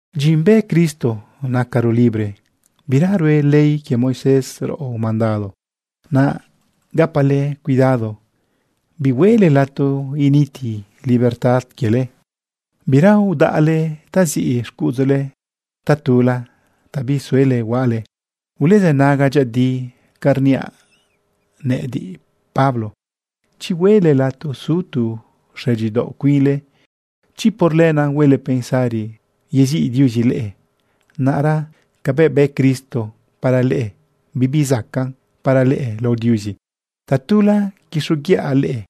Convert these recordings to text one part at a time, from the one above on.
Dyin bë Cristo nacaro libre, bira rue ley quie Moisés raꞌo mandado. Naꞌ gapale cuidado bihuele lato initi libertad quiele. Bira udaꞌle taziꞌ xcuꞌudzule tatula ta bisuele huaꞌale. Ulezënaga dyëꞌëdi ca rniaꞌ nëꞌëdiꞌ, Pablo. Chi huele lato su tu xëdyidaoꞌ cuinle, chi por lenaꞌ huele pensari yeziꞌ Diuzi leꞌe, naꞌra cabëꞌ bë Cristo para leꞌe, bibi zacaꞌn para leꞌe lao Diuzi. Tatula quixoguiꞌa leꞌe: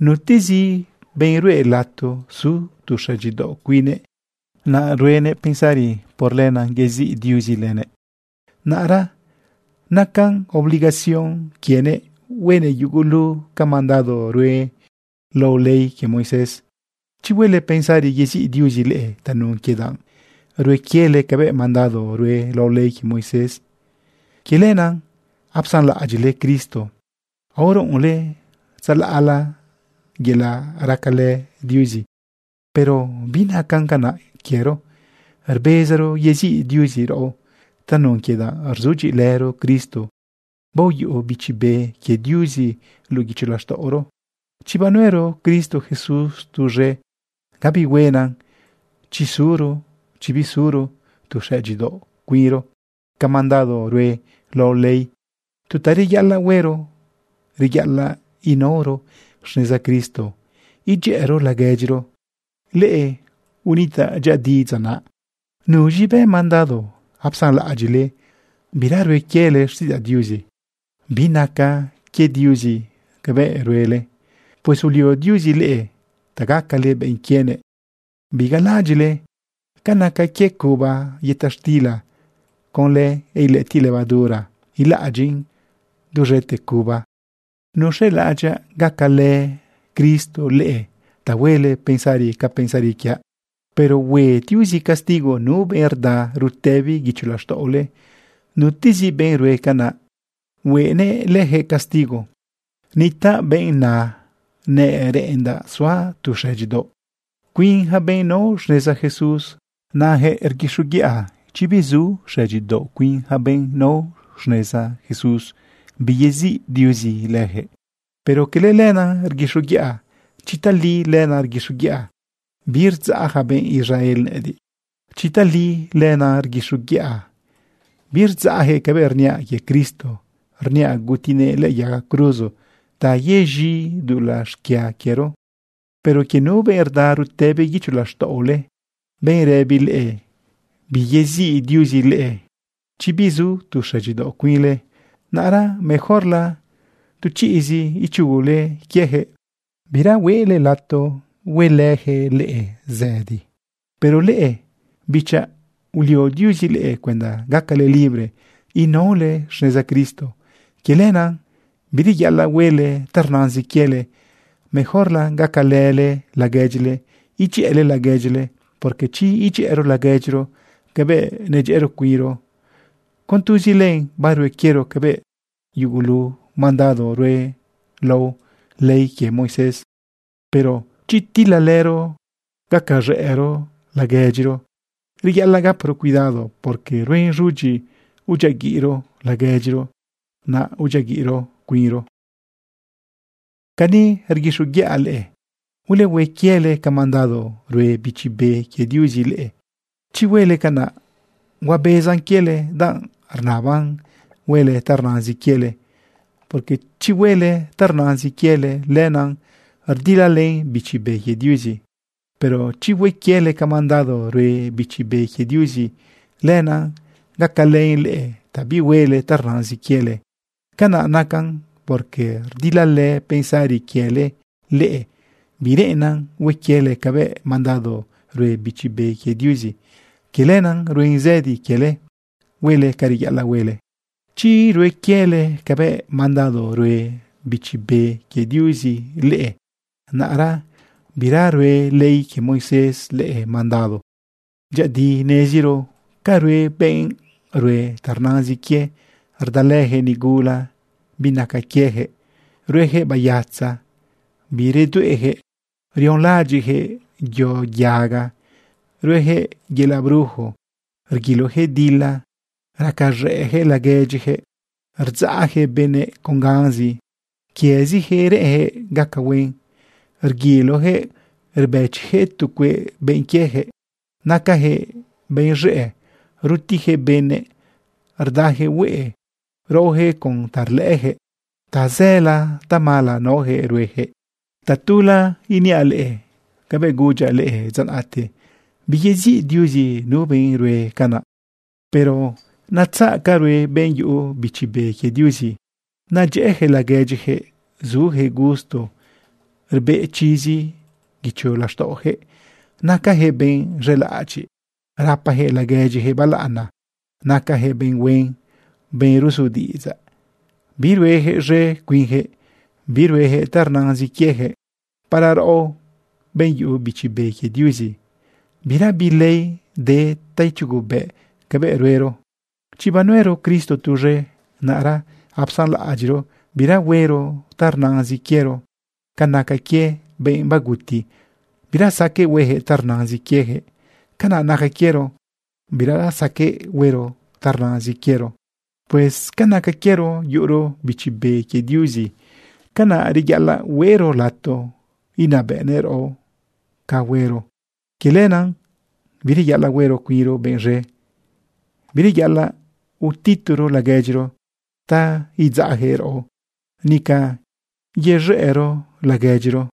Nutezi benꞌ ruꞌe lato su tu xëdyidaoꞌ cuine, yelaꞌ naꞌ huenëꞌ pensari por lenaꞌ yeziꞌ Diuzi lëbëꞌ, naꞌra nacan obligación quienëꞌ huenëꞌ yugulu ca mandado rue lao ley quie Moisés. Chi huele pensari yeziꞌ Diuzi leꞌe tanun quie danꞌ rue quiele cabëꞌ mandado rue lao ley quie Moisés, quie lenaꞌ apsanlaꞌadyiꞌle Cristo, aoruꞌunle tzalaꞌla yelaꞌ racalë Diuzi. Pero binacan canaꞌ quiero. Rbezaro yeziꞌ Diuzi raꞌo tanun quie danꞌ rzudyiꞌilëro Cristo baoyuꞌu Bichi Be quie Diuzi luꞌu guicho laxtaꞌoro. Chi banuero Cristo Jesús tuz̃e, gabi huenan chi zuro, chi bizuro, tu xëdyidaoꞌ cuinro ca mandado rue lao ley. Tu ta reyaꞌalaꞌ huero, reyaꞌalaꞌ inaoro xneza Cristo edyëꞌëro laguedyiro. Leꞌe unitaꞌ dyëꞌëdi dza naꞌ. ¿Nuz̃i bë mandado apsanlaꞌadyiꞌle bira rue quiele xtiꞌidzaꞌ Diuzi? Binaca quie Diuzi cabëꞌ ruele. Pues ulio Diuzi leꞌe ta gacale benꞌ quienëꞌ. Bigalaꞌadyiꞌle ca naca quie cuba yëta xtila. Conlë ilëꞌëtiꞌ levadura ilaꞌadyin duz̃ete cuba. Nuz̃elaꞌadyaꞌ gacalë Cristo leꞌe ta huele pensari ca pensari quiaꞌ. Pero hue Diuzi castigo nu benꞌ rda rutëbi guicho laxtaꞌole. Nutezi benꞌ rue canaꞌ huenëꞌ lëjëꞌ castigo. Nitaꞌ benꞌ na nereꞌendaꞌ suaꞌ tu xëdyidaoꞌ cuin yaca benꞌ nao xneza Jesús. Nayaquëꞌ rguixoguiꞌa chi bizu xëdyidaoꞌ cuin yaca benꞌ nao xneza Jesús, biyeziꞌ Diuzi leyaquëꞌ. Pero cala lenaꞌ rguixoguiꞌa. Chi tali lenaꞌ rguixoguiꞌa, birdzaꞌ yaca benꞌ Israel nëꞌëdiꞌ. Chi tali lenaꞌ rguixoguiꞌa, birdzaꞌyaquëꞌ cabëꞌ rniaꞌ quie Cristo rniaꞌ gutinëꞌ lëꞌë yaga cruzo ta yez̃i dulaꞌ xquia quiero. Pero quie nu benꞌ rda rutëbi guicho laxtaꞌole, benꞌ rëbi leꞌe biyeziꞌ Diuzi leꞌe chi bizu tu xëdyidaoꞌ cuinle, naꞌra mejorla tu chiꞌzi ichugule quiejëꞌ, bira huele lato huelëyaquëꞌ leꞌe zëdi. Pero leꞌe, bichaꞌ, ulio Diuzi leꞌe cuenda gacale libre inaole xneza Cristo. Quie lenaꞌ bireyaꞌalaꞌ huele ta rnazin quiele. Mejorla gacalële laguedyile edyëꞌële laguedyile. Porque chi edyëꞌëro laguedyiro cabëꞌ nedyëꞌëro cuinro, con tuzi len barue quiero cabëꞌ yugulu mandado rue lao ley quie Moisés. Pero chi tilalëro gacaz̃ëꞌro laguedyiro, reyaꞌalaꞌ gaparo cuidado, porque ruen z̃udyi udyiaguiꞌro laguedyiro, naꞌ udyiaguiꞌro cuinro. Cani rguixoguiꞌa leꞌe: Ulehue quiele ca mandado rue Bichi Be quie Diuzi leꞌe. Chi huele canaꞌ, huabezan quiele danꞌ rnaban huele ta rnazin quiele. Porque chi huele ta rnazin quiele, lenaꞌ rdilalën Bichi Be quie Diuzi. Pero chi hue quiele ca mandado rue Bichi Be quie Diuzi, lenaꞌ gacalën leꞌe ta bihuele ta rnazin quiele. Canaꞌ nacan porque rdilalë pensari quiele leꞌe, bireꞌennan hue quiele cabëꞌ mandado rue Bichi Be quie Diuzi. Quie lenaꞌ ruen zëdi quiele huele ca reyaꞌalaꞌ huele. Chi rue quiele cabëꞌ mandado rue Bichi Be quie Diuzi leꞌe, naꞌra bira rue ley quie Moisés leꞌe mandado. Dyëꞌëdi neziro ca rue benꞌ rue ta rnazin quie. Rdalëyaquëꞌ nigula binaca quieyaquëꞌ, ruejëꞌ bayatza, biredueꞌyaquëꞌ, rionlaꞌadyiꞌyaquëꞌ yo yaga, ruejëꞌ yelaꞌ brujo, rguiloyaquëꞌ dila, racaz̃ëꞌyaquëꞌ laguedyiyaquëꞌ, rdzaꞌjëꞌ benëꞌ con ganzi, quiezijëꞌ reꞌenjëꞌ gaca huen, rguiloyaquëꞌ rbëchiyaquëꞌ tu cueꞌ benꞌ quieyaquëꞌ. Nacajëꞌ benꞌ z̃ëꞌ, rutijëꞌ benëꞌ, rdajëꞌ hueꞌe, raojëꞌ con ta rlëꞌëyaquëꞌ, tazëla tamala naoyaquëꞌ rueyaquëꞌ. Tatula iniaꞌ leꞌe cabëꞌ gudyaꞌ leꞌe dza naꞌte: Biyeziꞌ Diuzi nu benꞌ rue canaꞌ. Pero netzaꞌ ca rue benꞌ yuꞌu Bichi Be quie Diuzi. Nadyëꞌëyaquëꞌ laguedyiyaquëꞌ, sujëꞌ gusto, rbeꞌ chizi guicho laxtaꞌojëꞌ, nacajëꞌ benꞌ z̃elaꞌadyiꞌ, rapajëꞌ laguedyijëꞌ balaꞌana, nacajëꞌ benꞌ huen, benꞌ ruzu diꞌidzaꞌ. Biruejëꞌ z̃e cuinjëꞌ, biruejëꞌ ta rnazin quieyaquëꞌ. Para raꞌo, benꞌ yuꞌu Bichi Be quie Diuzi, birabi ley de ta ichugubëꞌ cabëꞌ ruero. Chi banuero Cristo tuz̃e, naꞌra apsanlaꞌadyiꞌro bira huero ta rnazin quiero. Ca naca quie benꞌ baguti, bira saqueꞌ huejëꞌ ta rnazin quieyaquëꞌ, canaꞌ naca quiero, bira saqueꞌ huero ta rnazin quiero. Pues ca naca quiero yuꞌuro Bichi Be quie Diuzi, canaꞌ reyaꞌalaꞌ huero lato inabëꞌnëꞌ raꞌo ca huero. Quie lenaꞌ bireyaꞌalaꞌ huero cuinro benꞌ z̃e. Bireyaꞌalaꞌ utituro laguedyiro ta idzaꞌyaquëꞌ raꞌo, nica yez̃ëꞌro laguedyiro.